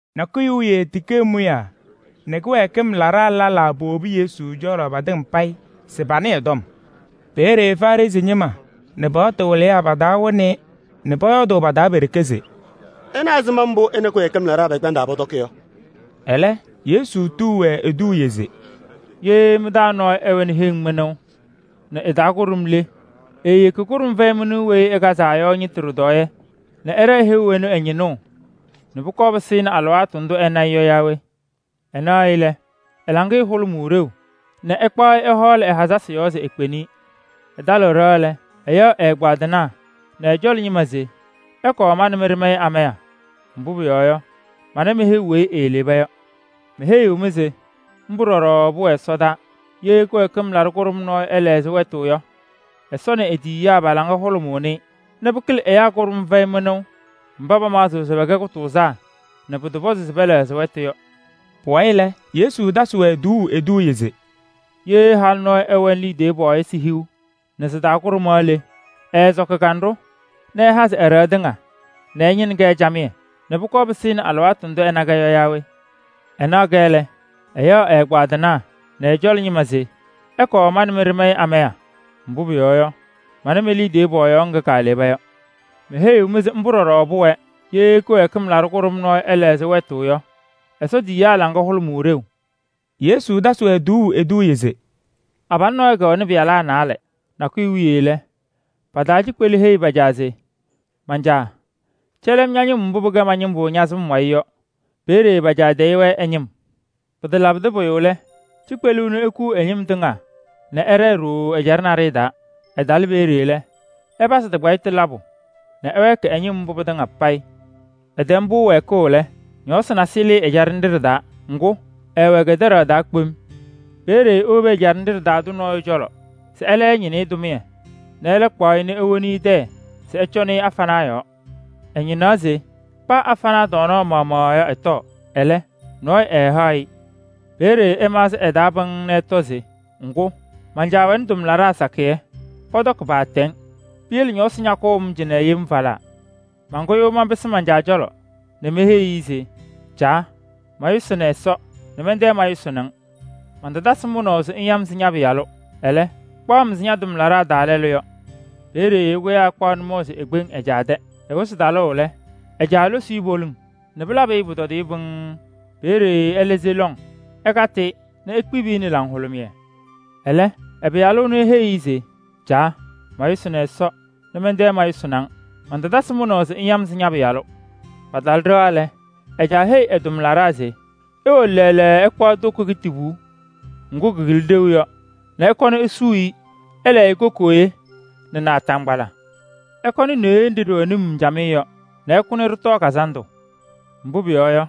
Nakʋyʋ wiye tikee mʋyaa nɛ kɩwɛɛkɩm laɖaa lɛlaa powobi Yesu cɔlɔ patɩŋa payɩ se panɩɩ ɛ-tɔm. Peeye Farɩsɩ ñɩma nɛ paɣtʋ wɩlɩyaa pa-taa wɩnɩ-ɩ nɛ pɔyɔɔdʋʋ pa-taa pe-ɖeke se: “Ɩna ɛzɩma mbʋ ɛ nɛ kɩwɛɛkɩm laɖaa pɛkpɛndaa pɔtɔkɩ yɔ!” Ɛlɛ Yesu tuu-wɛ eduuye se: “Ye mɩ-taa nɔɔyʋ ɛwɛnɩ heŋ mɩnʋʋ nɛ ɩ-taa kʋɖʋm le, eeyeki kʋɖʋm fɛyɩ mɩnʋʋ weyi ɩkazaa yɔ ñɩtʋ ɖɩtɔɔyɛ nɛ ɛɖɛɛ heu ɛnʋ ɛ-ñɩnʋʋ nɛ pʋkɔɔ pɩsɩnɩ alɩwaatʋ ndʋ ɛna-ɩ yɔ yaa we? Ɛnaɣ-ɩ lɛ, ɛ-laŋɩyɛ hʋlʋmʋʋ ɖeu nɛ ɛkpaɣ-ɩ ɛhɔɔlɩ ɛ-hazasɩ yɔɔ se ekpeni-i. Ɛtalɩɣ ɖɩɣa lɛ, ɛyaɣ ɛ-ɛgbaadɩnaa nɛ ɛ-cɔlɔ ñɩma se: ‘Ɩkɔɔ ma nɛ mɩ ɖɩmayɩ amaya. Mbʋ pʋyɔɔ yɔ, mana me-heu weyi eeleba yɔ.’ Meheyiɣ-mɩ se mbʋ ɖɔɖɔ pʋwɛ ɛsɔdaa: ye kɩwɛɛkɩm laɖʋ kʋɖʋm nɔɔyʋ ɛlɛɣzɩ wɛtʋ yɔ, Ɛsɔ nɛ e-tiyiyaa pa-laŋa hʋlʋmʋʋnɩ-ɩ nɛ pɩkɩlɩ ɛyaa kʋɖʋm fɛyɩ mɩnʋʋ mba pamaɣzɩɣ se pɛkɛ kʋtʋʋzaa nɛ pʋtɔpɔzɩ se pɛlɛɣzɩ wɛtʋ yɔ.” Pʋwayɩ lɛ, Yesu tasɩ-wɛ tuuu eduuye se: “Ye halʋ nɔɔyʋ ɛwɛnɩ liidiye pɔɔyɩsɩ hiu nɛ sɩ-taa kʋɖʋmaɣ le, ɛɛsɔkɩ kanɖʋ nɛ ɛhazɩ ɛ-ɖɩɣa tɩŋa nɛ ɛñɩnɩ-kɛ camɩyɛ nɛ pʋkɔɔ pɩsɩnɩ alɩwaatʋ ndʋ ɛna-kɛ yɔ yaa we? Ɛnaɣ-kɛ lɛ, ɛyaɣ ɛ-ɛgbaadɩnaa nɛ ɛ-cɔlɔ ñɩma se: ‘Ɩkɔɔ ma nɛ mɩ ɖɩmayɩ amaya. Mbʋ pʋyɔɔ yɔ, mana me-liidiye pɔɔyaɣ ŋga kaaleba yɔ.’ Meheyiɣ-mɩ se mbʋ ɖɔɖɔ pʋwɛɛ: ye kɩwɛɛkɩm laɖʋ kʋɖʋm nɔɔyʋ ɛlɛɣzɩ wɛtʋ yɔ, Ɛsɔ tiyiyaa laŋa hʋlʋmʋʋ ɖeu.” Yesu tasɩ-wɛ tuuu eduuye se: “Abalʋ nɔɔyʋ kɛwɛnɩ pɩyalaa naalɛ. Nakʋyʋ wiye lɛ, pa-taa cikpelu heyi pa-caa se: ‘Man-caa! Cɛlɩ-m ña-ñɩm mbʋ pɩkɛɣ ma-ñɩmbʋ ña-sɩm wayɩ yɔ.’ Peeye pa-caa tayɩ-wɛ ɛ-ñɩm. Pɩtalabɩdɩ pʋyʋ lɛ, cikpelu ɛnʋ ekuu ɛ-ñɩm tɩŋa nɛ ɛɖɛɛ ɖooo ɛjaɖɛ naɖɩyɛ taa. Ɛtalɩ peeye lɛ, ɛpazɩ tɩkpayɩtʋ labʋ nɛ ɛwɛɛkɩ ɛ-ñɩm mbʋ pɩtɩŋa payɩ. Ɛtɛm-pʋ wɛɛkʋʋ lɛ, ñɔɔsɩ nasɩyɩ lɩɩ ɛjaɖɛ nɖɩ ɖɩ-taa. Ŋgʋ, ɛɛwɛ kɛdɛɖaɣ taa kpem. Peeye ewobi ɛjaɖɛ nɖɩ ɖɩ-taa tʋ nɔɔyʋ cɔlɔ se ɛlɛ ɛñɩnɩ-ɩ tʋmɩyɛ nɛ ɛlɛ kpaɣ-ɩ ewoni tɛyɛ se ɛcɔŋnɩ-ɩ afanaa yɔɔ. Ɛñɩnaɣ se paa afanaa tɔɔnaɣ maɣmaɣ yɔ ɛtɔɔ. Ɛlɛ, nɔɔyʋ ɛɛhaɣ-ɩ. Peeye ɛmaɣzɩ ɛ-taa pɩŋŋ nɛ ɛtɔ se: ‘Ŋgʋ, man-caa wɛnɩ tʋmlaɖaa sakɩyɛ, pɔtɔkɩ paatɛŋ. Piyele ñɔɔsɩ ñakʋʋ-m cɩnɛ yem falaa! Mankʋyʋʋ manpɩsɩ man-caa cɔlɔ nɛ meheyi-i se: caa! Mayʋsɩnɩ Ɛsɔ nɛ mɛntɛ mayʋsɩnɩ-ŋ. Mantatasɩ mʋnaʋ se ŋya-m se ña-pɩyalʋ. Ɛlɛ, kpaɣ-m ɛzɩ ña-tʋmlaɖaa taa lɛlʋ yɔ.’ Peeye ɛkʋyaa ɛkpaɣ nʋmɔʋ se ekpeŋ ɛ-caa tɛ. Ɛwɩzɩ talʋʋ lɛ, ɛ-caa losi-i poliŋ nɛ pɩlabɩ-ɩ pʋtɔdɩyɛ pɩŋŋ. Peeye ɛlɛ se lɔŋ ɛkatɩ-ɩ nɛ ekpibi-i nɛ laŋhʋlʋmɩyɛ. Ɛlɛ ɛ-pɩyalʋ ɛnʋ eheyi-i se: ‘Caa! Mayʋsɩnɩ Ɛsɔ nɛ mɛntɛ mayʋsɩnɩ-ŋ. Mantatasɩ mʋnaʋ se ŋya-m se ña-pɩyalʋ.’ Patalɩ ɖɩɣa lɛ, ɛ-caa heyi ɛ-tʋmlaɖaa se: ‘Iwolo ɖasam ɩkpaɣ toko kitibuu ŋgʋ kɩkɩlɩ ɖeu yɔ nɛ ɩkɔnɩ isuu-i. Ɩlɛɛ-ɩ kokooye nɛ naataŋgbala. Ɩkɔnɩ neɣye nɖɩ ɖɩwɛ num camɩyɛ yɔ nɛ ɩkʋ nɛ ɖɩtɔɔ kazandʋ. Mbʋ pʋyɔɔ yɔ,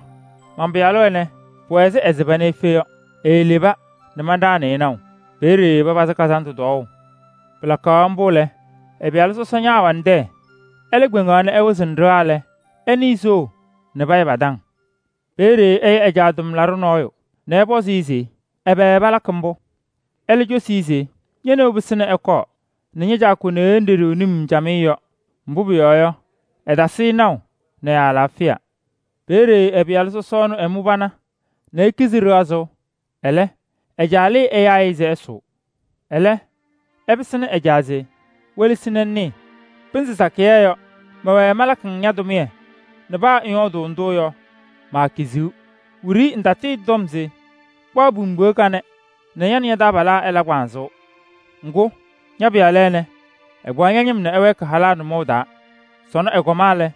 man-pɩyalʋ ɛnɛ, pʋwɛ ɛzɩ ɛsɩba nɛ efe yɔ. Eeleba nɛ manɖaɣnɩ-ɩ naʋ.’ Peeye papazɩ kazandʋ tɔɔʋ. Pɩlakaɣ mbʋ lɛ, ɛ-pɩyalʋ sɔsɔ ñaawɛnɩ tɛyɛ. Ɛlɛ kpeŋaɣ nɛ ɛwɩzɩnɩ ɖɩɣa lɛ, ɛnɩɩ soo nɛ payɛ pa-taŋ. Peeye ɛya ɛ-caa tʋmlaɖʋ nɔɔyʋ nɛ ɛpɔzɩ-ɩ se: ‘Ɛbɛ palakɩ mbʋ?’ Ɛlɛ cosi-i se: ‘Ñe-neu pɩsɩnɩ ɛkɔɔ nɛ ña-caa kʋ neɣye nɖɩ ɖɩwɛ num camɩyɛ yɔ, mbʋ pʋyɔɔ yɔ, ɛtasɩ-ɩ naʋ nɛ ɛ-alaafɩya.’ Peeye ɛ-pɩyalʋ sɔsɔ ɛnʋ ɛmʋ pana nɛ ekizi ɖɩɣa sʋʋ. Ɛlɛ ɛ-caa lɩɩ ɛyaa-ɩ se ɛsʋʋ. Ɛlɛ ɛpɩsɩnɩ ɛ-caa se: ‘Welesi nɛ ŋnɩɩ, pɩnzɩ sakɩyɛ yɔ, mɛwɛɛ malakɩ-ŋ tʋmɩyɛ nɛ paa ŋyɔɔdɩ ndʋ yɔ, maakiziɣ.’ Wiɖiyi ŋtatɩɩtɔm se: ‘Kpaɣ pimbiɣa kanɛ nɛ ña nɛ ña-taabalaa ɩla kpanzʋʋ.’ Ŋgʋ, ña-pɩyalʋ ɛnɛ, ɛkpaɣ ña-ñɩm nɛ ɛwɛɛkɩ halaa nʋmɔʋ taa. Sɔnɔ ɛkɔma lɛ,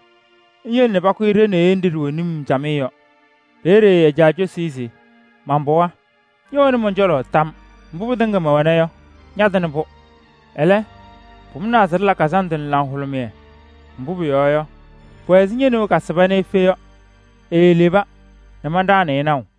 ŋyele pakʋ-ɩ ɖe-neɣye nɖɩ ɖɩwɛ num camɩyɛ yɔ. Peeye ɛ-caa cosi-i se: ‘Man-pɩɣa! Ñɛwɛnɩ mɔn-cɔlɔ tam. Mbʋ pɩtɩŋa mɛwɛna yɔ, ñatɩnɩ-pʋ. Ɛlɛ, pʋmʋnaa se ɖɩla kazandʋ nɛ laŋhʋlʋmɩyɛ. Mbʋ pʋyɔɔ yɔ, pʋwɛ ɛzɩ ñe-neu kasɩba nɛ efe yɔ, eeleba nɛ manɖaɣnɩ-ɩ naʋ.’”